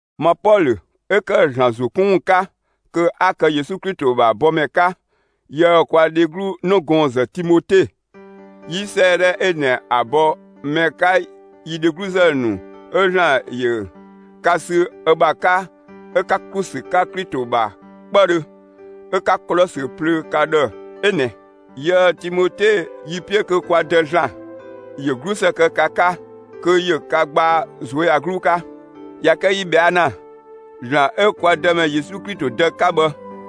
Ma Pɔlö, 'ö ‑kë ‑Zlan ‑zo 'kun ‑wun 'ka kö 'a kë Yesu Klito ‑bha bɔmɛ 'ka, yië‑ kwa dheglu 'nëgɔɔnzë Timote, 'yi 'sëëdhɛ 'ö ꞊nɛ ‑a bɔ mɛ 'ka yi dhegluzë ‑nu 'ö ‑Zlan ‑yö ka sü ö ‑bha 'ka 'ö 'ka ‑klu ‑sü 'ka Klito ‑bha 'kpëdhö, 'ö 'ka Kolɔsö plöö ka ‑dhë 'ö ꞊nɛ. Yië‑ Timote yi‑ 'piö kö kwa Dë ‑Zlan ‑yö 'glusë kë ka 'ka, kö ‑yö ka gbaa ꞊zuöyagluu 'ka. ꞊Ya kë yi ꞊bhɛa' ‑na, ‑Zlan 'ö kwa Dëmɛ Yesu Klito Dë 'ka bhë,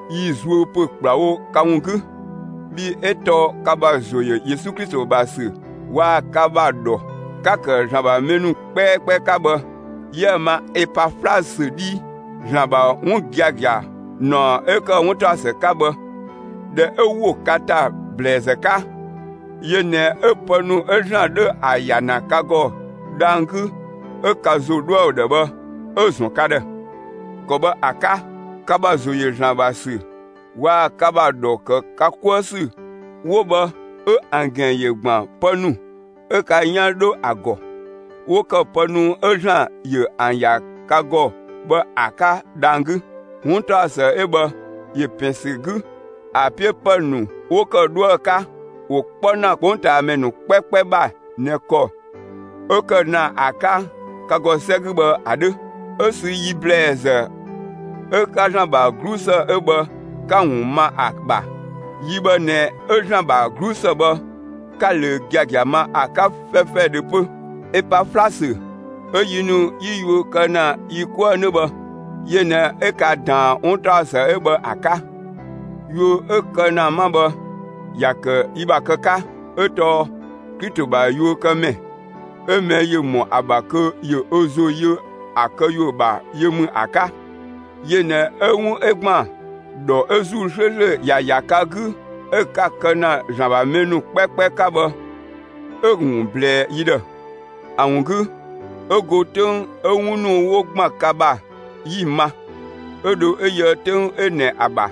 'yi‑ zuö pö ‑kplawo ka ‑wun 'gü. Bhii 'ö tɔɔ ka ‑bha ‑zo ‑yö Yesu Klito ‑bha ‑sü waa‑ ka ‑bha ‑dhɔ, 'ka‑ ‑kë ‑Zlan ‑bha mɛ ‑nu 'kpɛkpɛ 'ka bhë, 'yië‑ ma (Epaflasö 'dhii). ‑Zlan ‑bha 'wun giagia ‑naɔ 'ö ‑kë 'wuntaɔsë 'ka bhë, ꞊dhɛ 'ö ‑wo ka ‑ta ‑blɛɛzë 'ka, yö ꞊nɛ 'ö pë ‑nu 'ö ‑Zlan 'dhö ‑a ‑ya ‑na ka ‑gɔ dhang‑ 'gü 'ö ka ‑zo 'dhoë‑ ‑dhë bhë, 'ö‑ ‑zɔn ka ‑dhë. ‑Kɔ bhë ‑a 'ka, ka ‑bha ‑zo ‑yö ‑Zlan ‑bha ‑sü waa‑ ka ‑bha ‑dhɔ ‑kë ka 'kuë ‑sü 'wo bhë 'ö ‑an ‑gɛn ‑yö ‑gban pë ‑nu 'ö ka 'yan 'dhö ‑a ‑gɔ, 'wo ‑kë pë ‑nu 'ö ‑Zlan ‑yö ‑an ‑ya ka ‑gɔ bhë ‑a 'ka dhang‑ 'gü. 'Wuntaɔsë 'ö bhë ‑yö ‑pɛn ‑sü 'gü; ‑a 'piö ‑pë ‑nu 'wo ‑kë 'dhuë‑ 'ka, ‑wo 'kpɔ ‑na 'kpongtaamɛ ‑nu 'kpɛkpɛ ‑bha ꞊nɛ ‑kɔ 'ö‑ kë ‑na ‑a 'ka ka ‑gɔ 'sɛ 'gü bhë ‑a 'dhö, 'ö sü yi ‑blɛɛzë 'ö 'ka ‑Zlan ‑bha 'glusë 'ö bhë, 'ka‑ ‑wun ma ‑a ‑bha. Yi bhë ꞊nɛ 'ö ‑Zlan ‑bha 'glusë bhë, 'ka‑ ꞊löö giagia ma ‑a 'ka 'fɛfɛdhö 'pö. Epaflasö, 'ö yi ‑nu 'yi yuö kë ‑na yi 'kuë‑ 'nö bhë, yö ꞊nɛ 'ö ka ꞊daan 'wuntaɔsë 'ö bhë ‑a 'ka. Yuö 'ö‑ kë ‑na 'ma bhë, ‑ya ‑kë yi ‑bha kë 'ka, 'ö tɔɔ Klito ‑bha yuökëmɛ, 'ö mɛ ‑yö ‑mɔ ‑a ‑bha kö ‑yö ö ‑zo yö ‑a këyuö ‑bha yö ‑mü ‑a 'ka. Yö ꞊nɛ 'ö 'wun 'ö ‑gban ‑dhɔ 'ö ‑Zuu 'slööslö ‑ya ‑ya ka 'gü 'ö 'ka‑ kë ‑na ‑Zlan ‑bha mɛ ‑nu 'kpɛkpɛ 'ka bhë, 'ö‑ ‑wun ꞊blɛɛ yi ‑dhë. ‑A ‑wun 'gü, 'ö go 'töng 'ö 'wun ‑nu 'wo ‑gban ka ‑bha, 'yi‑ ma, 'ö dho 'ö yöë 'töng 'ö ꞊nɛ ‑a ‑bha,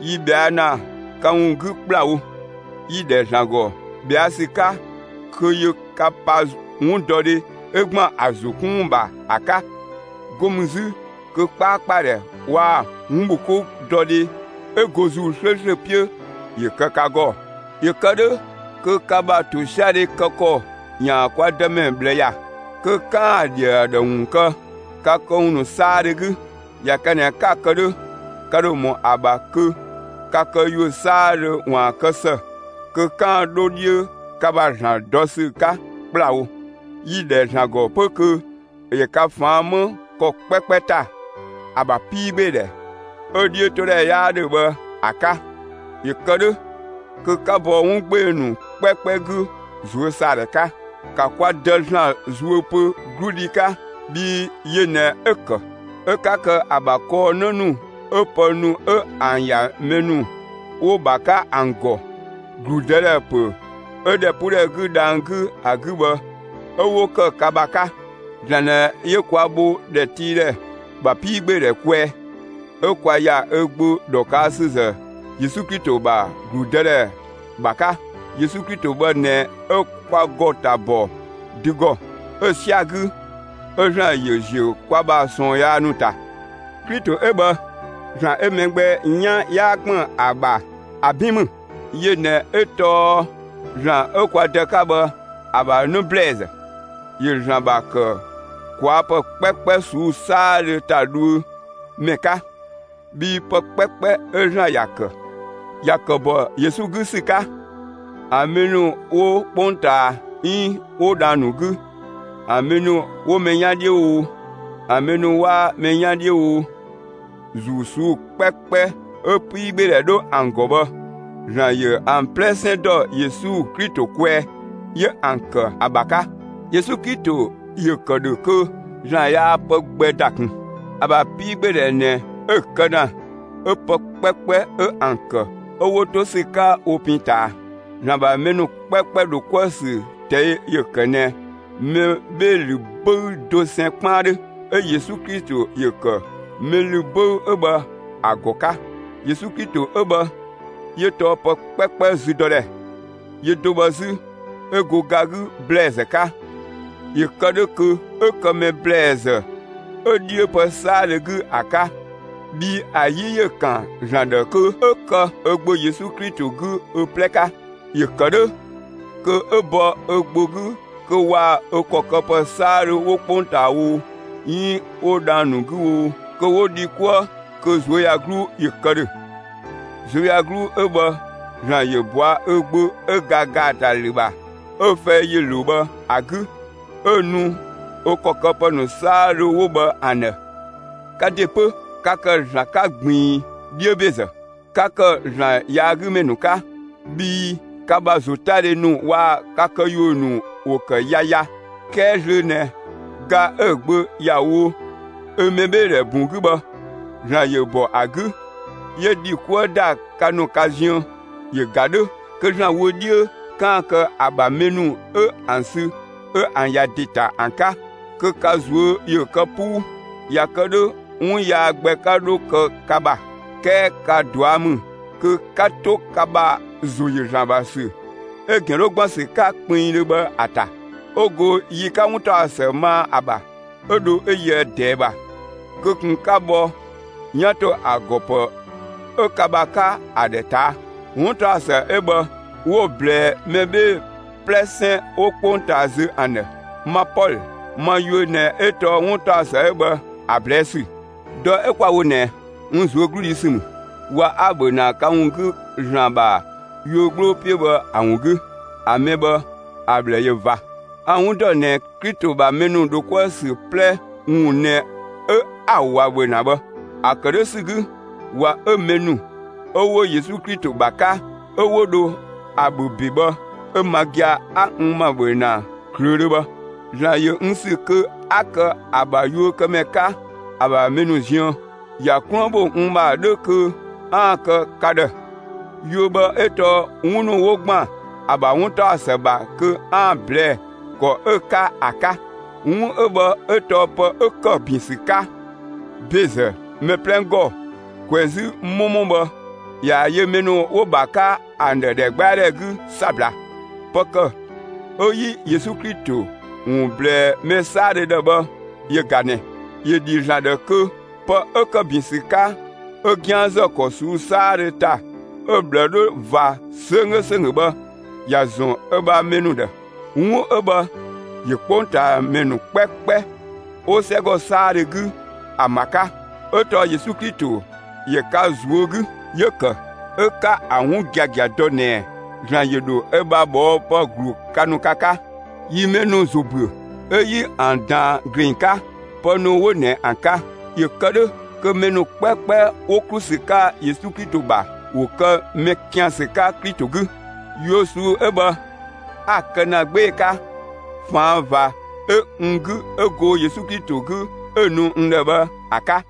yi ꞊bhɛa' ‑na ka ‑wun 'gü ‑kplawo. Yi‑ ‑dhɛ ‑Zlan ‑gɔ ꞊bhɛa' ‑sü 'ka kö ‑yö ka pa 'wundɔdhe 'ö ‑gban ‑a ‑zo 'kun ‑wun ‑bha ‑a 'ka. 'Go mü 'zü kö 'kpaakpadhɛ waa‑ 'wunbhokoudɔdhe 'ö go ‑Zuu 'slööslö 'piö ‑yö kë ka ‑gɔ. ‑Yö kë 'dhö kö ka ‑bha ‑tosiadhe kë ‑kɔ ‑yaan kwa Dëmɛ ꞊bhlë ‑ya, kö 'kaan‑ ‑a ‑dhi ‑a ‑dhë ‑wun kë ka këwun ‑nu 'saadhö 'gü. ꞊Ya kë ꞊nɛ 'ka‑ kë 'dhö, ka ‑dho ‑mɔ ‑a ‑bha kö ka këyuö 'saadhö ‑waan kë ‑së, kö 'kaan‑ 'dho 'dhiö ka ‑bha ‑Zlan dɔ ‑sü 'ka ‑kplawo. Yi‑ ‑dhɛ ‑Zlan ‑gɔ 'pö kö ‑yö ka ꞊faan' 'më ‑kɔ 'kpɛkpɛ ‑ta, ‑a ‑bha 'piigbeedhɛ 'ö‑ 'dhiötodhɛ 'yaa 'dhö bhë ‑a 'ka. ‑Yö kë 'dhö kö 'ka bɔ 'wun 'gbee‑ ‑nu 'kpɛkpɛ 'gü ꞊zuösaadhɛ 'ka. ‑Ka kwa Dë ‑Zlan zuö pö 'gludhi 'ka! Bhii yö ꞊nɛ 'ö‑ ‑kë, 'ö 'ka kë ‑a ‑bha kɔɔ 'në ‑nu 'ö pë ‑nu 'ö ‑an ‑ya mɛ ‑nu 'wo‑ ‑bha 'ka ‑an ‑gɔ, ‑gludëdhɛ ‑pö 'ö ‑dhɛpuudhɛ 'gü dhang‑ 'gü ‑a 'gü bhë, 'ö 'wo ‑kë ka ‑bha 'ka. ‑Zlan ꞊nɛ 'yö kwa bho ‑dhɛtiidhɛ ‑bha 'piigbeedhɛ kwɛɛ, 'ö kwa ‑ya ö Gbö ‑dhɔkësüzë Yesu Klito ‑bha ‑gludëdhɛ ‑bha 'ka. Yesu Klito bhë ꞊nɛ 'ö kwa ‑gɔ ‑ta ‑bɔ dü ‑gɔ, 'ö‑ 'sia‑ 'gü, 'ö ‑Zlan ‑yö ‑ziö kwa ‑bha ꞊sɔɔn yaa ‑nu ‑ta. Klito 'ö bhë, ‑Zlan 'ö mɛ gbɛ 'yan 'yaa ‑kpën ‑a ‑bha, ‑a 'bin ‑mü. Yö ꞊nɛ 'ö tɔɔ ‑Zlan 'ö kwa Dë 'ka bhë, ‑a ‑bha 'në ‑blɛɛzë; ‑yö ‑Zlan ‑bha ‑kë ꞊kwaa' ‑pë 'kpɛkpɛ ꞊suu'‑ 'saadhö ‑ta dhuö ‑mɛ 'ka. Bhii pë 'kpɛkpɛ 'ö ‑Zlan ‑ya ‑kë, ‑ya ‑kë ‑bɔ Yesu 'gü ‑sü 'ka; ‑a mɛ ‑nu 'wo 'kpongtaa 'iin 'wo dhang‑ ‑nu 'gü, ‑a mɛ ‑nu 'wo mɛ 'yan 'dhiö oo, ‑a mɛ ‑nu 'waa mɛ 'yaan 'dhiö oo, ‑zuu ꞊suu'‑ 'kpɛkpɛ 'ö 'piigbeedhɛ 'dhö ‑an ‑gɔ bhë, ‑Zlan ‑yö ‑an 'plɛsɛn ‑dɔ Yesu Klito kwɛɛ, 'yö ‑an ‑kë ‑a ‑bha 'ka. Yesu Klito ‑yö ‑kë ‑dhö kö ‑Zlan yaa pë gbɛ ‑da ꞊kun. ‑A ‑bha 'piigbeedhɛ ꞊nɛ 'ö‑ kë ‑na, 'ö pë 'kpɛkpɛ 'ö ‑an ‑kë 'ö 'wo 'to ‑sü 'ka wo pin ꞊taa. ‑Zlan ‑bha mɛ ‑nu 'kpɛkpɛ ‑dho 'kuë‑ ‑sü ꞊tɛi' ‑yö ‑kë ꞊nɛ mɛ 'bhee‑ ‑lü 'böü dosɛn 'kpaan 'dhö, 'ö Yesu Klito ‑yö ‑kë mɛ ‑lü 'böü 'ö bhë ‑a ‑gɔ 'ka. Yesu Klito 'ö bhë, 'yö tɔɔ pë 'kpɛkpɛ züdɔdhɛ. Yö do bhë 'zü, 'ö go ga 'gü ‑blɛɛzë 'ka, ‑yö kë 'dhö kö 'ö kë mɛ ‑blɛɛzë 'ö 'dhiö pë 'saadhö 'gü ‑a 'ka. Bhii ‑a 'yi ‑yö ‑kan ‑Zlan ‑dhë kö 'ö kë ö Gbö Yesu Klito 'gü ö 'plɛ 'ka. ‑Yö kë 'dhö kö 'ö bɔ ö Gbö 'gü kö waa‑ ö ‑kɔ këpë 'saadhö 'wo 'kpongtaa oo, 'iin 'wo dhang‑ ‑nu 'gü oo, kö 'wo dhi 'kuë kö ꞊zuöyagluu ‑yö kë ‑dhö. ꞊Zuöyagluu 'ö bhë ‑Zlan ‑yö ꞊bɔa' ö Gbö 'ö ga ‑gaatalü ‑bha, 'ö‑ fɛi ‑yö ‑lo bhë ‑a 'gü, 'ö‑ nu ö ‑kɔ këpë ‑nu 'saadhö 'wo bhë ‑an ‑dhë. Ka ‑de 'pö, ka ‑kë ‑Zlan 'ka ꞊gbiin 'dhiö ‑bezë, 'ka ‑kë ‑Zlan yaagümɛ ‑nu 'ka, bhii ka ‑bha ‑zotadhe ‑nu waa‑ ka këyuö ‑nu ‑wo ‑kë yaya. 'Kɛɛ zlöö ꞊nɛ, ga 'ö‑ Gbö ‑ya wo ö mɛbheedhɛ ‑bun 'gü bhë, ‑Zlan ‑yö ‑bɔ ‑a 'gü, 'yö ‑dhi 'kuë ‑da ka ‑nu ka ziën. ‑Yö ‑ga 'dhö, kö ‑Zlan wö 'dhiö, 'kaan‑ kë ‑a ‑bha mɛ ‑nu 'ö ‑an sü 'ö ‑an ‑ya ‑de ‑ta ‑an 'ka, kö ka ꞊zuö' ‑yö kë 'puu; ꞊ya kë 'dhö 'wun yaa gbɛ 'ka 'dho kë ka ‑bha. 'Kɛɛ ka ꞊dua' ‑mü kö 'ka 'to ka ‑bha ‑zo ‑yö ‑Zlan ‑bha ‑sü 'ö‑ ‑gɛn 'dhö ‑gban ‑sü 'ka kpinngdhö bhë ‑a ‑ta. 'Ö go yi 'ka 'wuntaɔsë maa ‑a ‑bha, 'ö dho 'ö yöë ꞊dɛɛ ‑bha kö ꞊kun 'ka bhɔ 'yan ‑to ‑a ‑gɔ ‑pë 'ö ka ‑bha 'ka ‑a ‑dhë ꞊taa'. 'Wuntaɔsë 'ö bhë 'wo‑ ꞊blɛɛ mɛ 'bhee‑ 'plɛsɛn 'wo 'kpongtaa zö ‑an ‑dhë. Ma Pɔlö, ma yuö ꞊nɛ 'ö tɔɔ 'wuntaɔsë 'ö bhë ‑a ꞊blɛɛ' ‑sü. Dɔ 'ö 'kwa‑ wo ꞊nɛ, n ꞊zuögludhi ‑sü ‑mü ꞊wa 'a‑ ‑bhö ‑na ka ‑wun 'gü ‑Zlan ‑bha yuö 'gbloo 'piö bhë ‑a ‑wun 'gü. ‑A mɛ bhë, ‑a ꞊bhlë ꞊yö ꞊va. A‑ 'wun ‑dɔ ꞊nɛ Klito ‑bha mɛ ‑nu dho 'kuë‑ ‑sü 'plɛ ‑wun ꞊nɛ 'ö 'a‑ ꞊wa ‑bhö ‑na bhë. ‑A ‑kë 'dhö ‑sü 'gü, ꞊wa 'ö mɛ ‑nu 'ö 'wo Yesu Klito ‑bha 'ka, 'ö 'wo dho ‑a ‑bhö ‑be bhë, 'ö ma gia‑ 'a n ‑ma ‑bhö ‑na ꞊klöödhö bhë. ‑Zlan ‑yö n ‑sü kö 'a kë ö bha yuökëmɛ 'ka ‑a ‑bha mɛ ‑nu ziën; ‑ya 'kluën bho n ‑ma 'dhö kö 'aan‑ kë ka ‑dhë. Yuö bhë 'ö tɔɔ 'wun ‑nu 'wo ‑gban ‑a ‑bha 'wuntaɔsë ‑bha kö 'aan‑ ꞊blɛɛ'‑ ‑kɔ 'ö‑ 'ka ‑a 'ka. 'Wun bhë 'ö tɔɔ pë 'ö ‑kë ‑bin ‑sü 'ka ‑bezë mɛ 'plɛ ‑gɔ ꞊kwɛzü 'mɔmɔ bhë, ꞊yaa‑ yö mɛ ‑nu 'wo‑ ‑bha 'ka ‑an ‑dhë ‑dhɛgbɛadhɛ 'gü 'sabla. Pë ‑kë 'ö 'yi Yesu Klito ‑wun ꞊blɛɛ mɛ 'saadhö ‑dhë bhë yö ꞊ga ꞊nɛ: ‑Yö ‑dhi ‑Zlan ‑dhë kö pë 'ö ‑kë ‑bin ‑sü 'ka 'ö 'gianzë ‑kɔ ꞊suu'‑ 'saadhö ‑ta 'ö‑ ꞊bhlë 'dhö ꞊va 'sönggö ‑sönggö bhë, ‑ya ‑zɔn ö ‑bha mɛ ‑nu ‑dhë. 'Wun 'ö bhë ‑yö 'kpongtaamɛ ‑nu 'kpɛkpɛ, 'wo 'sɛgɔ 'saadhö 'gü, ‑an ‑bha 'ka; 'ö tɔɔ Yesu Klito ‑yö ka ꞊zuö' 'gü. 'Yö‑ ‑kë 'ö 'ka ‑a 'wun giagia dɔ ꞊nɛɛ ‑Zlan ‑yö ‑dho ö ‑bha ꞊bhɔɔpë ‑glu ka ‑nu ka 'ka. Yi mɛ ‑nu ‑zo ‑büö, 'ö 'yi ‑an ꞊daan ‑gleng 'ka, pë ‑nu 'wo ꞊nɛ ‑an 'ka. ‑Yö ‑kë 'dhö kö mɛ ‑nu 'kpɛkpɛ 'wo ‑klu ‑sü 'ka Yesu Klito ‑bha, ‑wo kë mɛ ‑kiansü 'ka Klito 'gü. Yuö ꞊suu'‑ 'ö bhë 'a‑ kë ‑na 'gbee‑ 'ka ꞊faan' ꞊va 'ö n 'gü 'ö go Yesu Klito 'gü 'ö‑ nu n ‑dhë bhë ‑a 'ka.